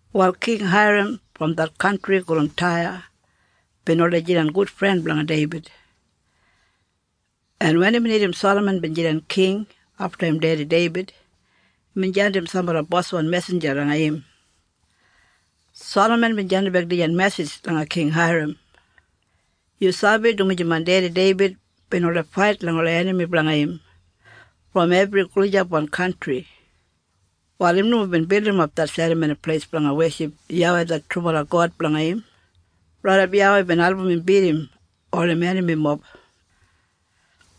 Wal King Hairam brom det kantri gulum Taya bin oldei jidan gudfren blanga Deibid, en wen imbin irrim Salaman bin jidan king afta im dedi Deibid, imbin jandim sambala boswan mesinja langa im. Salaman bin jandimbek dijan mesij langa King Hairam. “Yu sabi dumaji main dedi Deibid bin oldei fait langa ola enami blanga im brom ebri gulijapwan kantri, wal im nomo bin bildimap det Serramoni Pleis blanga weship YAWEI det trubala God blanga im, raidap YAWEI bin album im bidim ol im enamimob.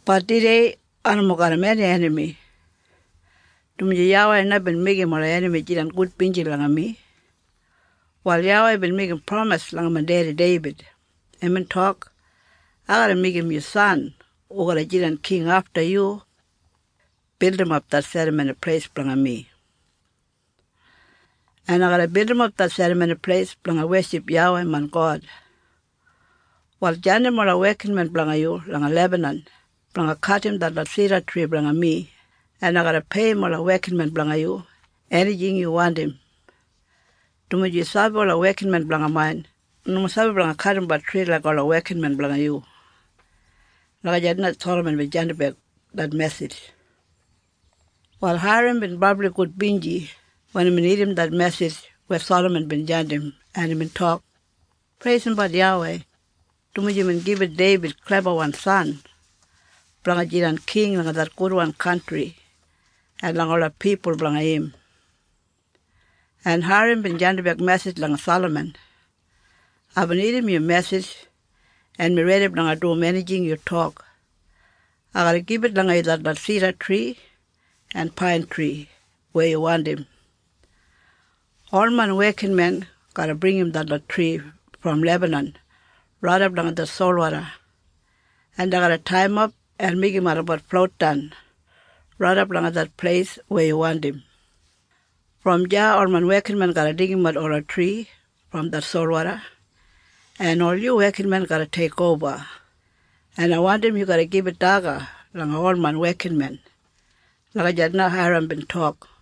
Bat tudei ai nomo garram eni enami, dumaji YAWEI na bin meigim ola enami jidan gudbinji langa mi. Wal YAWEI bin meigim pramis langa main dedi Deibid. Imbin tok, ‘Ai garra meigim yu san hu garra jidan king afta yu bildimap det Serramoni Pleis blanga mi.’ En ai garra bildimap det Serramoni Pleis blanga weship YAWEI main God. Wal jandim ola wekinmen blanga yu langa Lebanon blanga kadim detlot sidatri blanga mi en ai garra peiyim ola wekinmen blanga yu enijing yu wandim. Dumaji yu sabi ola wekinmen blanga main nomo sabi blanga kadimbat tri laik ola wekinmen blanga yu.” Lagijat na Salaman bin jandimbek det mesij. Wal Hairam bin brabli gudbinji wen imbin irrim det mesij weya Salaman bin jandim, en imbin tok, “Preisimbat YAWEI, dumaji imbin gibit Deibid klebawan san blanga jidan king langa det gudwan kantri en langa ola pipul blanga im.” En Hairam bin jandimbek mesij langa Salaman, “Aibin irrim yu mesij en mi redi blanga dum enijing yu tok. Ai garra gibit langa yu detlot sidatri en paintri weya yu wandim. Ol main wekinmen garra bringim detlot tri brom Lebanan raidap langa det solwoda en dei garra taiyimap en meigim olabat floutdan raidap langa det pleis weya yu wandim. Brom deya ol main wekinmen garra deigimat ola tri brom det solwoda, en ol yu wekinmen garra teikoba. En ai wandim yu garra gibit daga langa ol main wekinmen.” Lagijat na Hairam bin tok.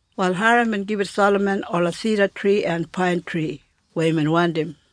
Wal Hairam bin gibit Salaman ola sidatri en paintri weya imbin wandim.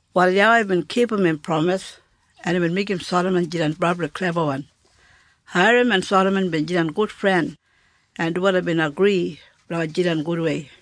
Wal YAWEI bin kipum im pramis en imbin meigim Salaman jidan brabli klebawan. Hairam en Salaman bin jidan gudfren, en dubala bin agri blanga jidan gudwei.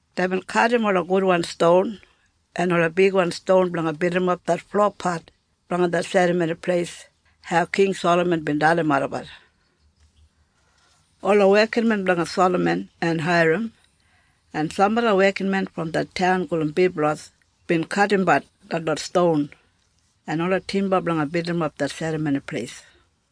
Deibin kadim ola gudwan ston en ola bigwan ston blanga bildimap det flopat blanga det Serramoni Pleis hau King Salaman bin dalim olabat. Ola wekinmen blanga Salaman en Hairam, en sambala wekinmen brom det taun gulum Biblos bin kadimbat detlot ston en ola timba blanga bildimap det Serramoni Pleis.